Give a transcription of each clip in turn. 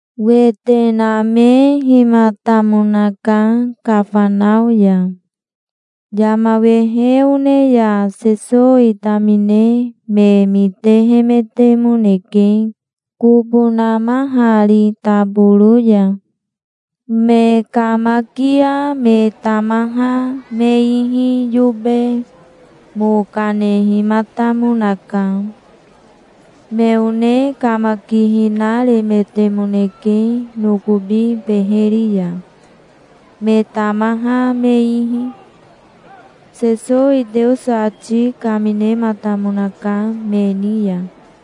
Wete namehimatamonaka Kafanao ya. Yama wehe one ya Sesowi tamine me mitehemetemoneke kobo namahari taboro ya. Me kamakia me tamaha me ihi yobe mo kanehimatamonaka. Me one kamakihina remetemoneke nokobi beheri ya, me tamaha me ihi. Sesowi Teoso ati kaminematamonaka me ni ya.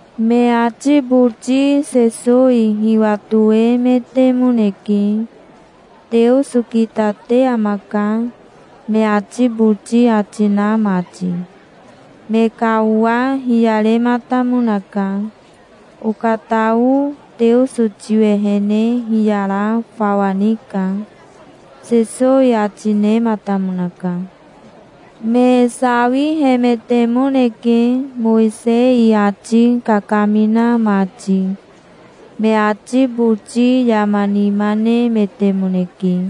Me ati boti Sesowi hiwatoemetemoneke, "Teoso kitate amaka", me ati boti ati na mati. Me ka owa hiyarematamonaka. "Okatao Teoso tiwehene hiyara fawa nika", Sesowi ati nematamonaka. Me sawihemetemoneke, Mowisei ati kakamina mati. Me ati boti yama nima nemetemoneke,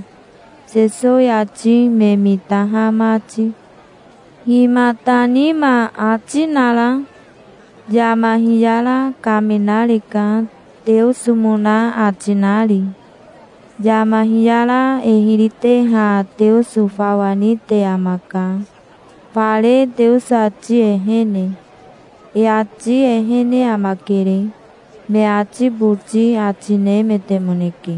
Sesowi ati me mitaha mati. "Himata nima ati nara? Yama hiyara kaminareka, Teosomona ati nari. Yama hiyara e hiri teha Teoso fawa nite amaka, fare Teoso ati ehene. E ati ehene amakere", me ati boti ati nemetemoneke.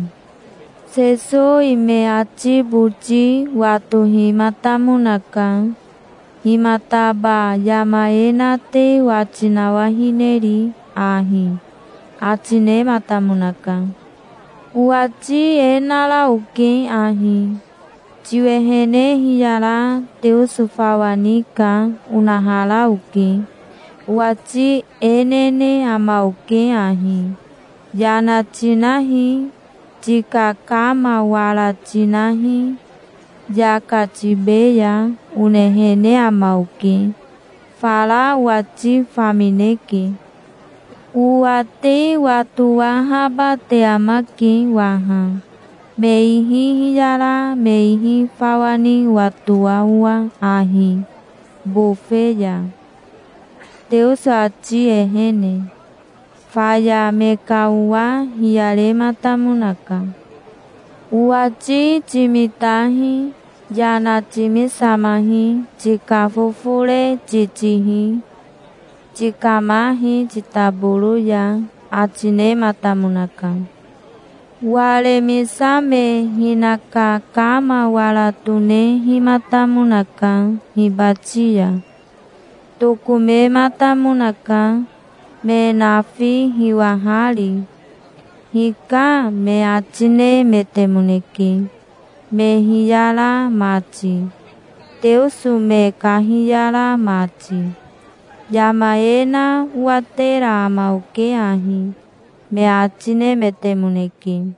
Sesowi me ati boti watohimatamonaka. "Himataba yama e na te wati nawahineri ahi", ati nematamonaka. "Owati e nara oke ahi: 'Tiwehene hiyara Teoso fawa nika', onahara oke. Owati e nene ama oke ahi: 'Yana tinahi. Tika kama wara tinahi. Yaka tibeya', onehene ama oke. Fara owati famineke. Owa te watowahaba te amake waha, me ihi hiyara me ihi fawa ni owatoa owa ahi, bofe ya, Teoso ati ehene". Faya me ka owa hiyarematamonaka. "Owati timitahi. Yana timisamahi. Tika fofore titihi. Tikamahi titaboro ya", ati nematamonaka. Waremisame hinaka kama wara tonehimatamonaka hibati ya. Tokomematamonaka, me nafi hiwahari. "Hika", me ati nemetemoneke, me hiyara mati, Teoso me kahiyara mati. "Yama e na owatera ama oke ahi", me ati nemetemoneke.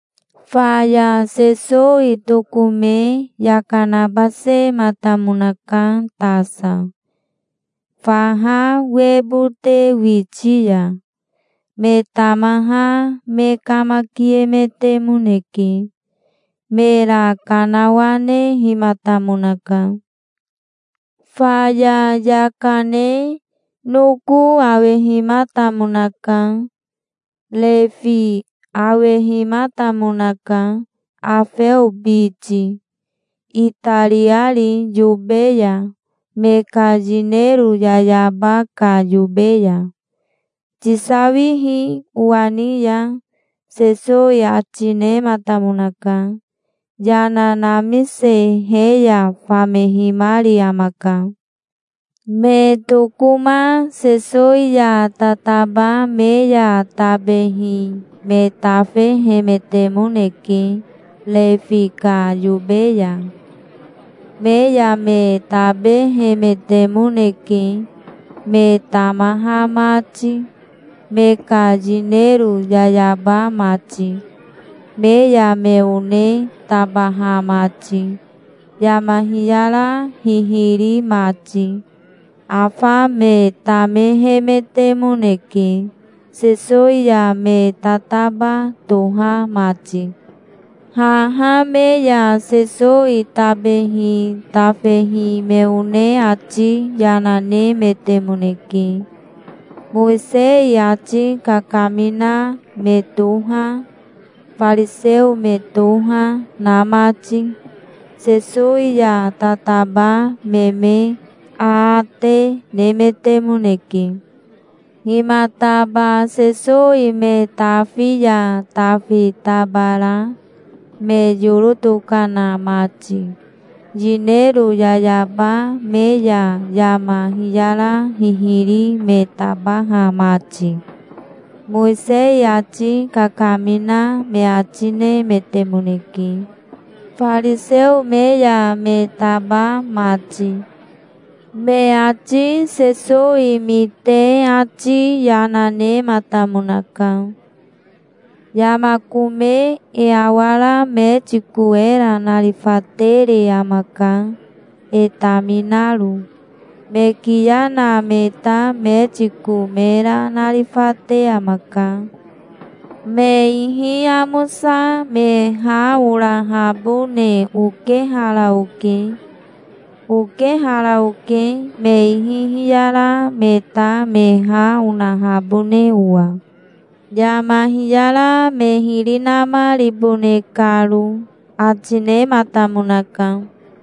Faya Sesowi tokome yaka nabasematamonaka tasa, faha webote witi ya. Me tamaha me kamakiemetemoneke. Mera kanawanehimatamonaka. Faya yaka ne noko awehimatamonaka. Refi awehimatamonaka, Afeo biti, itariari yobe ya, me ka yinero yayaba ka yobe ya."Tisawihi owa ni ya", Sesowi ati nematamonaka. Yana namise he ya famehimari amaka. Me tokoma Sesowi ya tataba me ya tabehi me tafehemetemoneke Refi ka yobe ya. Me ya me tabehemetemoneke, me tamaha mati, me ka yinero yayaba mati, me ya me one tabaha mati, yama hiyara hihiri mati. Afa me tamehemetemoneke, Sesowi ya me tataba toha mati. Haha me ya Sesowi tabehi tafehi me one ati yana nemetemoneke, Mowisei ati kakamina me toha, fariseo me toha, na mati. Sesowi ya tataba me me aate nemetemoneke. "Himataba Sesowi me tafi ya tafi tabara, me yoro tokana mati, yinero yayaba me ya yama hiyara hihiri me tabaha mati?", Mowisei ati kakamina me ati nemetemoneke, fariseo me ya me taba mati. Me ati Sesowi mite ati yana nematamonaka. "Yama kome e awara metiko era narifatere amaka, e taminaro. Me kiya na me ta metiko mera narifate amaka. Me ihi amosa me ha orahabone okehara oke. Okehara oke, me ihi hiyara me ta me ha onahabone owa, yama hiyara me hiri namaribone karo", ati nematamonaka.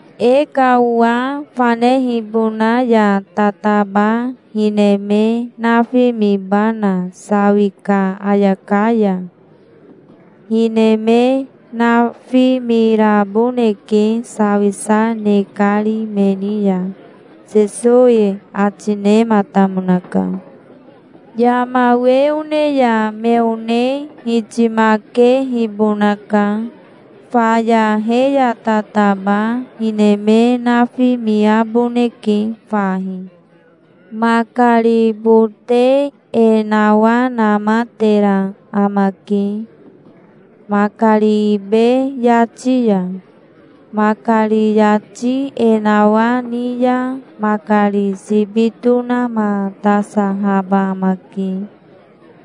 "E ka owa fanehibona ya tataba hine me nafimibana, sawi ka ayaka ya? Hine me nafimiraboneke sawisa ne kari me ni ya", Sesowi ati nematamonaka. "Yama we one ya me one hitimakehibonaka. Faya he ya tataba hine me nafimiaboneke fahi". "Makari bote e nawanamatera amake makari ibe yati ya. Makari yati e nawani ya makari sibi tonamatasahaba amake,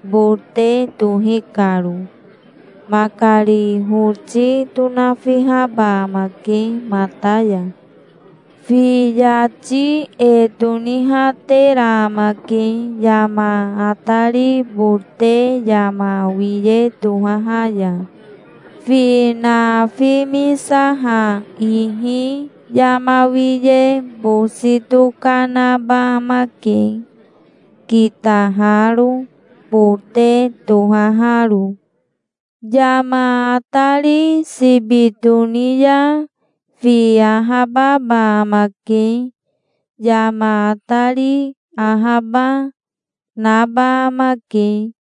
bote tohi karo. Makari hoti tonafihaba amake mata ya. Fi yati e tonihatera amake yama atari bote yama wiye tohaha ya. Fi nafimisaha ihi yama wiye bosi tokanaba amake, kitaharo, bote tohaharo. Yama atari sibi toni ya fi ahababa amake. Yama atari ahaba, naba amake.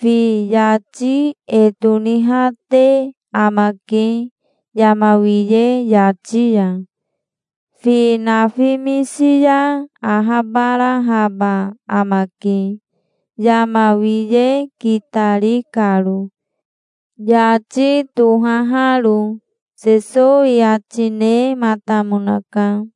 Fi yati e tonihate amake yama wiye yati ya. Fi nafimisi ya ahabarahaba amake, yama wiye kitari karo, yati tohaharo", Sesowi ati nematamonaka.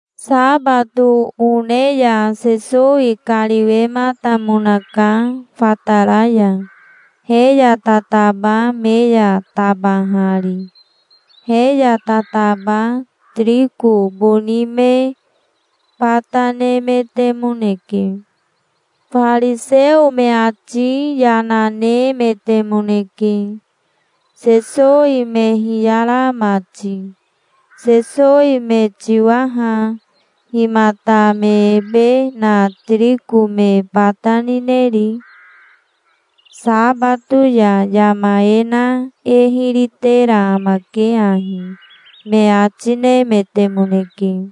Sabato one ya Sesowi kariwematamonaka fatara ya, he ya tataba me ya tabahari. He ya tataba tiriko boni me bata nemetemoneke. Fariseo me ati yana nemetemoneke, Sesowi me hiyara mati. "Sesowi me tiwa ha. Himata me ebe na tiriko me bata nineri? Sabato ya yama e na e hiri tera amake ahi", me ati nemetemoneke.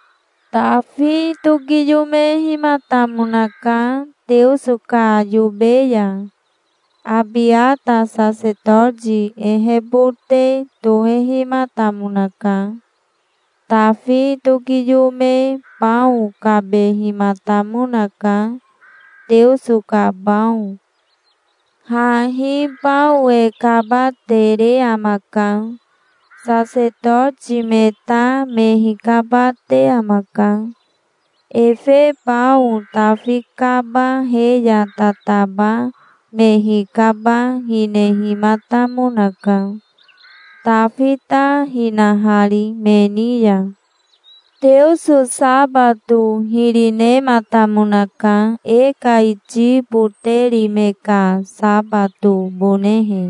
Tafi tokiyomehimatamonaka Teoso ka yobe ya. Abiata sasetoti ehebote tohehimatamonaka. Tafi tokiyome bao kabehimatamonaka, Teoso ka bao. Hahi bao e kabatere amaka. Sasetoti me ta me hikabate amaka. Efe bao Tafi kaba he ya tataba me hikaba hinehimatamonaka, Tafi ta hinahari me ni ya. Teoso sabato hiri nematamonaka e ka iti boteri me ka sabatobonehe.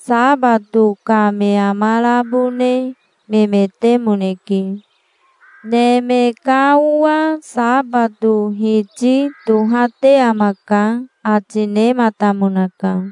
Sabato ka me amarabone memetemoneke. Neme ka Owa sabato Hiti tohate amaka", ati nematamonaka.